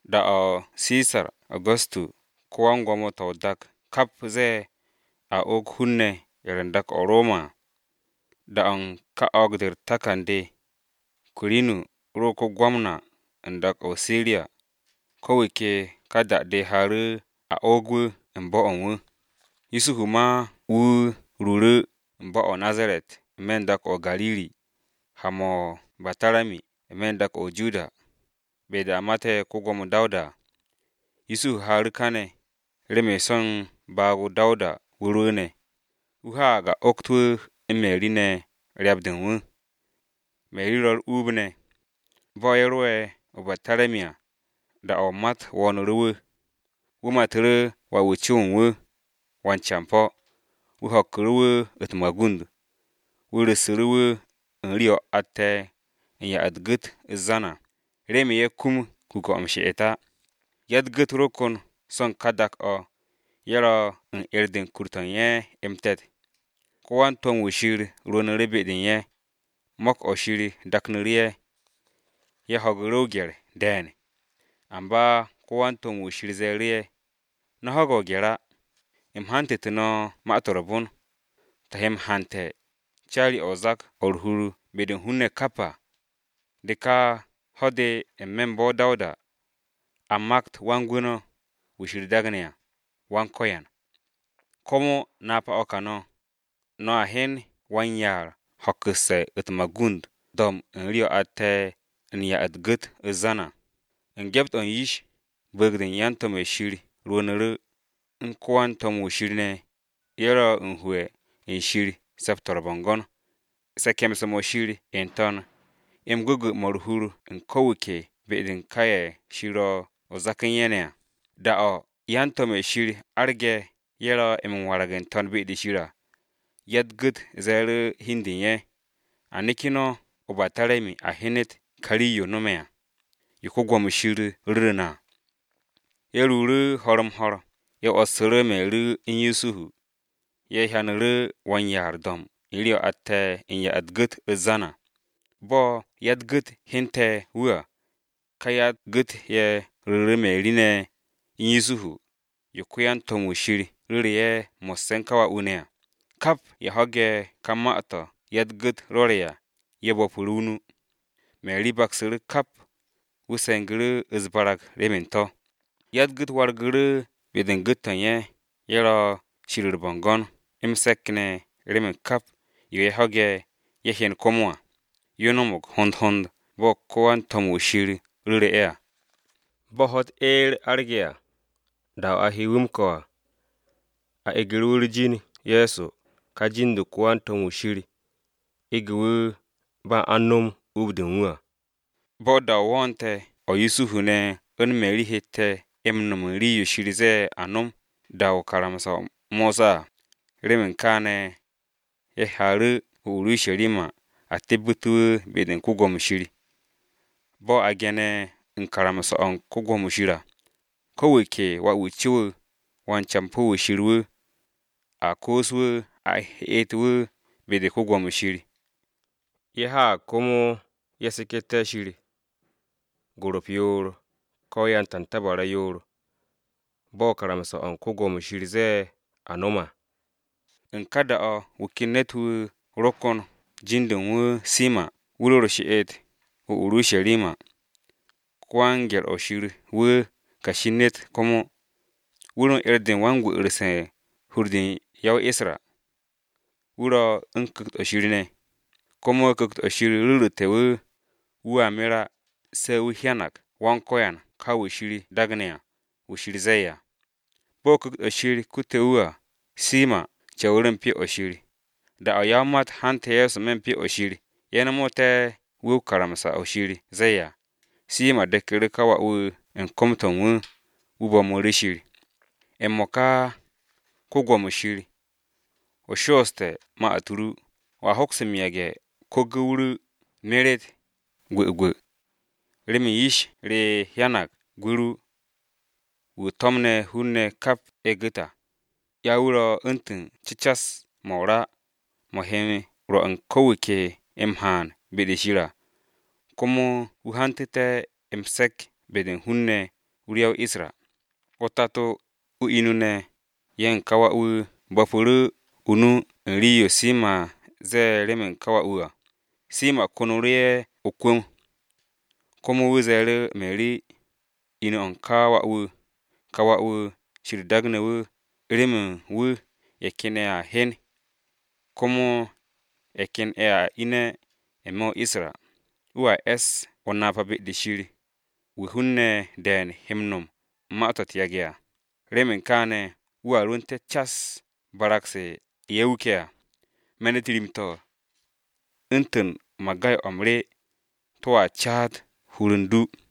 Da-o̱ ko-Gwo̱mo Sisar Agusu̱tu ko-wan-gwo̱mo-to̱ o-dak kap ze̱e̱, a oog hun-ne̱ ye̱ ro u̱n dak-to̱ Roma à. Da-o̱ u̱n ka o̱o̱g-de u̱r-takan de, Kwirinu ro ko-Gwamna u̱n dak-o̱ o-Siriya. Ko̱ wu̱ ke ka da-de haaru̱ a o̱o̱g wu̱ u̱n bo̱-o̱ u̱n wu̱. Yusuhu ma wu̱ ruuru̱ u̱n bo̱-o̱ o-Nazaret n-me̱ u̱n dak-o̱ o-Gariri, ha-mo̱ o-Be̱tarami n-me̱ u̱n dak-o̱ o-Judiya, be-de a mate̱ ko-Gwo̱mo Dawuda à. Yusuhu haaru̱ kane̱, remen so̱ u̱n baag-o Dawuda wu̱ rwu̱u̱ne̱. Wu̱ haag a ogt wu̱ u̱n Meri ne̱, ryap-de u̱n wu̱. Meri ro̱ u̱r-uub ne̱. Bo̱ ye̱ ro'e̱ o-Be̱tarami à, da-o̱ o-mat wo̱o̱nu̱ru̱ wu̱. Wu̱ matu̱ru̱ wà-wu̱ co-o̱ u̱n wu̱, wan-campo̱. Wu̱ ho̱kku̱ru̱ wu̱ u̱t-magund, wu̱ ru̱ssu̱ru̱ wu̱ u̱n rii-o̱ atte̱ u̱n ya-u̱t-gu̱t u̱t-zan à, remen ye̱ kum kuke̱-o̱ m-she'et á. Ya-u̱t-gu̱t ro kon so̱ u̱n ka dak-o̱, ye̱ ro̱ u̱n 'er-de u̱n kur-to̱ u̱n ye̱ m-te̱t. Ko-wan-to̱m-wu̱ Wan-Ko̱yan rwu̱u̱nu̱ru̱ be-de u̱n ye̱, se̱ps-mo̱ Shir daknu̱ru̱ u̱n ye̱. Ye̱ ho̱gu̱ru̱ o-gye̱r de̱e̱n. Amba ko-wan-to̱m-wu̱ Shir ze̱e̱ru̱ ye̱, “No̱ ho̱ge̱ o-gye̱r á! U̱m hantu̱te̱ no̱ Ma-to̱ m-Re̱re̱m, to̱ he m-hante̱ caari-o̱ o-zak o̱ u̱r-hur be-de u̱n hun-ne̱ kap à. De ka ho̱-de n-me̱ u̱n bo̱-o Dawuda, a makt Wan-Gwu̱ no̱, Kiristi, Go̱s-wu̱. Komo napa-o̱ ka no̱, no̱ hyen wan-yaar ho̱kku̱sse̱ u̱t-magund do̱mb u̱n rii-o̱ atte̱ u̱n ya-u̱t-gu̱t u̱t-zan à.” U̱n gyept-o̱ u̱n yish, bu̱u̱g-de u̱n yan-to̱m-ye̱ u̱n Shir n-To̱n rwu̱u̱nu̱ru̱, u̱n ko-wan-to̱m-wu̱ Shir ne̱, ye̱ ro u̱n hu'e̱ u̱n Shir se̱p-to̱ u̱r-bo̱ngo̱n: “Se̱ke̱mse̱-mo̱ Shir n-To̱n, m-gwu̱gwu̱ mo̱ u̱r-hur u̱n ko̱ wu̱ ke be-de u̱n ka ye̱ Shir ro̱ o-zak u̱n ye̱ ne̱ à!” Da-o̱ yan-to̱m-ye̱ Shir arge̱, ye̱ ro̱ m-warag n-to̱n be-de Shir à, ya-u̱t-gu̱t ze̱e̱ru̱ hi u̱n de u̱n ye̱, “A neke̱ no̱ o-Be̱tarami a hyenet ka rii-yo no̱me̱ à, yo Wan-Ko̱yan ru̱ru̱ na à.” Ye̱ ruuru̱ ho̱r-m-ho̱r, ye̱ 'wo̱ssu̱ru̱ Meri u̱n Yusuhu, ye̱ hyanu̱ru̱ wan-yaar do̱mb u̱n rii-o̱ atte̱ u̱n ya-u̱t-gu̱t u̱t-zan à. Bo̱ ya-u̱t-gu̱t hyente̱ wu̱ à, ka ya-u̱t-gu̱t ye̱ ru̱ru̱ Meri ne̱ u̱n Yusuhu, yo ko-yan-to̱m-ye̱ Shir ru̱ru̱ ye̱, mo̱sse̱ u̱n ka wà-wu̱ ne̱ à. Kap ye̱ ho̱ge̱ ka ma-to̱ ya-u̱t-gu̱t rwo̱re̱ à, ye̱ bo̱pu̱ru̱ o-nu. Meri baksu̱ru̱ kap, wu̱ se̱ngu̱ru̱ u̱s-barag remen to̱. Ya-u̱t-gu̱t wargu̱ru̱ be-de u̱n gu̱t-to̱ u̱n ye̱, ye̱ ro̱ Shir u̱r-bo̱ngo̱n m-se̱k ne̱ remen kap yo ye̱ ho̱ge̱, ye̱ hyen komo à, yo no̱mo̱g hond hond bo̱ ko-wan-to̱m-wu̱ Shir ru̱ru̱ ye̱ à. Bo̱ ho̱-u̱t eer arge̱ à, da-o̱ a he wu̱ m-ko̱ à, a egu̱ru̱ wu̱ u̱r-jin Ye̱so ka jin-de ko-wan-to̱m-wu̱ Shir ege̱ wu̱ ba a u̱n nom uub-de u̱n wu̱ á. Bo̱ da-o wo̱o̱nte̱ o̱ Yusuhu ne̱ u̱n Meri hette̱ m-no̱m u̱n rii-yo Shir ze̱e̱ a nom da-o u̱n karamsa-o Mosa à. Remen kaane̱, ye̱ haaru̱ o-Urusharima ye̱ tebbu̱te̱ wu̱ be-de u̱n Wan-Ko̱yan. Bo̱ a ge̱ne̱ u̱n karamsa-o̱ u̱n Wan-Ko̱yan à, “Ko̱ wu̱ ke wà-wu̱ co wu̱, wan-campo̱ wu̱ Shir wu̱, a koos wu̱ a heet wu̱ be-u̱r Yawe.” Ye̱ haag komo ye̱ seketé̱ Shir, gorop yoor, ko̱ yan-tantabara yoor, bo̱ karamsa-o̱ u̱n Wan-Ko̱yan ze̱e̱ a nom à. U̱n ka da-o̱ wu̱ ken ne̱t-wu̱ ro kon jin-de u̱n wu̱ Simo̱n wu̱ ro u̱r-she'et o-Urusharima. Ko-wan-gye̱r-o̱ Shir wu̱ kashi u̱n ne̱t komo, wu̱ ro u̱n 'er-de u̱n wan-m-gwu̱'u̱rse̱ u̱r-hur de ya-o-Isra. Wu̱ ro u̱n Ku̱kt-o̱ Shir ne̱. Komo Ku̱kt-o̱ Shir ru̱ru̱te̱ wu̱, wu̱a mer á, se̱ wu̱ hyanag Go̱s-wu̱ ka Kiristi, wu̱ Shir ze̱e̱ à. Bo̱ Ku̱kt-o̱ Shir kute̱ wu̱ à, Simo̱n co̱wu̱ru̱ u̱n Pyo-o̱ Shir. Da-o̱ ya-o-mat hante̱ Ye̱so n-me̱ u̱n Pyo-o̱ Shir ye̱ no̱mo̱te̱ wu̱ bo̱ karamsa-o̱ Shir ze̱e̱ à. Simo̱n deku̱ru̱ ka wà-wu̱ u̱n kom-to̱ u̱n wu̱, wu̱ bo̱mu̱ru̱ Shir: “M-mo̱ka, ko-Gwo̱mo Wan-Ko̱yan, o shooste̱ ma-u̱t ru, wo̱a hoks m-yage̱ u̱n ko-gu̱w ru meret gwu̱gwu̱. Remen yish re hyanag gwu̱ ru. Wu̱ o to̱mne̱ hun-ne̱ kap ye̱ gu̱t à. Ya wu̱ ro̱ u̱ntu̱n cecas-mo̱ o-ra, mo̱ he rwo̱ u̱n ko̱ wu̱ ke m-haan be-de Shir à, komo wu̱ hantu̱te̱ m-se̱ps be-de u̱n hun-ne̱ ru ya-o-Isra.” O-tato, o-inu ne̱, ye̱ u̱n ka wà-wu̱ bo̱pu̱ru̱ o-nu u̱n rii-yo Simo̱n ze̱e̱ remen ka wà-wu̱ à. Simo̱n konu̱ru̱ ye̱ o-kwu̱m. Komo wu̱ ze̱e̱ru̱ Meri, inu-o̱ u̱n ka wà-wu̱, “Ka wà-wu̱ Shir daagne̱ wu̱ remen wu̱ ye̱ ken ye̱a hye, komo ye̱ ken ye̱a ine̱ n-me̱ o-Isra. Wu̱a es o-napa be-de Shir, wu̱ hun-ne̱ de̱e̱n he m-no̱m ma-to̱ u̱t-yage̱ à. Remen kaane̱ wu̱a rwu̱nte̱ cas barag-se ye̱ wuke̱ à. Me̱n-u̱t rim-to̱, u̱ntu̱n magay-o̱ m-rye, to̱a caat hur u̱n du.”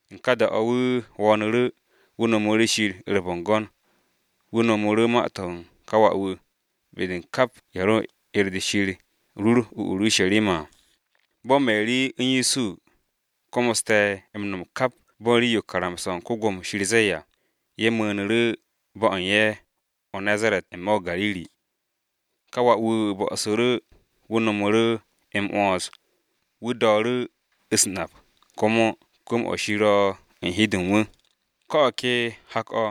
U̱n ka da-o̱, wu̱ wo̱o̱nu̱ru̱, wu̱ nomu̱ru̱ Shir u̱r-bo̱ngo̱n, wu̱ no̱mu̱ru̱ ma-to̱ u̱n ka wà-wu̱ be-de u̱n kap ye̱ ro u̱r-'er de Shir rur o-Urusharima à. Bo̱ Meri ne̱ u̱n Yusuhu, komoste̱ m-no̱m kap bo̱ u̱n rii-yo karamsa-o̱ u̱n Wan-Ko̱yan ze̱e̱ à, ye̱ mu̱u̱nu̱ru̱ bo̱-o̱ u̱n ye̱ o-Nazaret n-me̱ o-Gariri. Ka wà-wu̱ bo̱su̱ru̱ wu̱ no̱mu̱ru̱ m-'wo̱ns, wu̱ dooru̱ u̱s-nap, komo kwu̱m-o̱ Shir ro̱ u̱n hi-de u̱n wu̱. Ko̱ o̱ ke hak-o̱,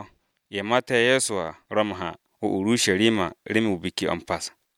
ye̱ mate̱ Ye̱so à ro̱ m-ha o-Urusharima remen Biki-o̱ m-Pas.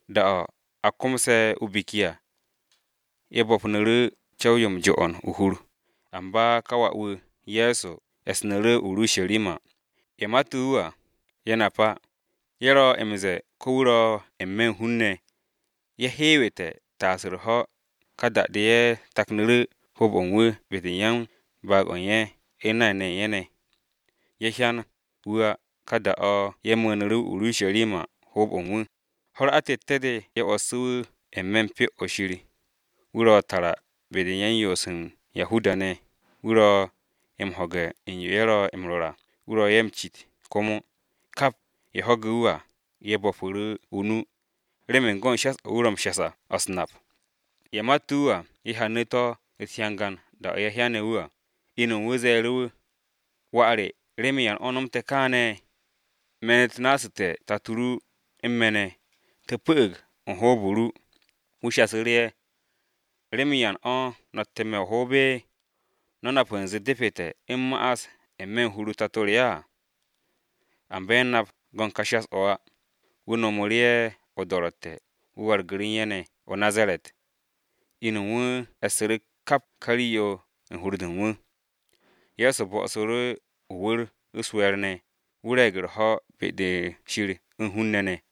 Da-o̱ a komse̱ o-biki à, ye̱ bo̱pnu̱ru̱ co̱w-yo m-jo'on o-hur, amba ka wà-wu̱ Ye̱so e̱snu̱ru̱ o-Urusharima. Ye̱ mate̱ wu̱ à, ye̱ nap á. Ye̱ ro̱ m-ze̱e̱ ko̱ wu̱ ro̱ n-me̱ u̱n hun-ne̱, ye̱ hewte̱ taas u̱r-ho̱, ka da-de ye̱ taknu̱ru̱ hoob-o̱ u̱n wu̱ be-de u̱n yan-baag-o̱ u̱n ye̱ u̱n nay u̱n ye̱ ne̱ ne̱. Ye̱ hyan wu̱ á, ka da-o̱ ye̱ mu̱u̱nu̱ru̱ o-Urusharima hoob-o̱ u̱n wu̱. Ho̱-u̱r atette̱-de ye̱ 'wo̱ssu̱ wu̱ n-me̱ u̱n Pyo-o̱ Shir, wu̱ ro̱ tara be-de u̱n yan-yoose̱ u̱n Yahuda-ne̱, wu̱ ro̱ m-ho̱ge̱ u̱n yo ye̱ ro̱ m-rwo̱r à, wu̱ ro̱ ye̱ m-cit komo. Kap ye̱ ho̱ge̱ wu̱ à, ye̱ bo̱pu̱ru̱ o-nu, remen go̱n shas-o̱ wu̱ ro̱ ye̱ m-shas à, o̱ u̱s-nap. Ye̱ mate̱ wu̱ à, ye̱ hyanu̱ to̱ u̱t-hyangan da-o̱ ye̱ hyane̱ wu̱ à, inu u̱n wu̱ ze̱e̱ru̱ wu̱, “Wà re, ¿remen yan o̱ o nomtu̱ te̱ kaane̱? Me̱n-u̱t nassu̱te̱ tato ru u̱n me̱ ne̱, te̱ pu̱'u̱g u̱n hoob-o ru.” Wu̱ shasu̱ru̱ ye̱, “¿Remen yan o̱ no̱ ro̱tte̱ me̱ o-hoob? ¿No̱ nap u̱nze depete̱ u̱m ma'as n-me̱ u̱n hur-o Tato re á?” Amba ye̱ nap go̱n ka shas-o̱ á. Wu̱ nomu̱ru̱ ye̱ o-do̱ro̱tte̱, wu̱ wargu̱ru̱ u̱n ye̱ ne̱ o-Nazaret. Inu u̱n wu̱ e̱ssu̱ru̱ kap ka rii-yo u̱n hur-de u̱n wu̱. Ye̱so bo̱'o̱ssu̱ru̱ o-wu̱r u̱s-we̱e̱r ne̱, wu̱ re̱e̱g u̱r-ho̱ be-de Shir u̱n hun-ne̱ ne̱.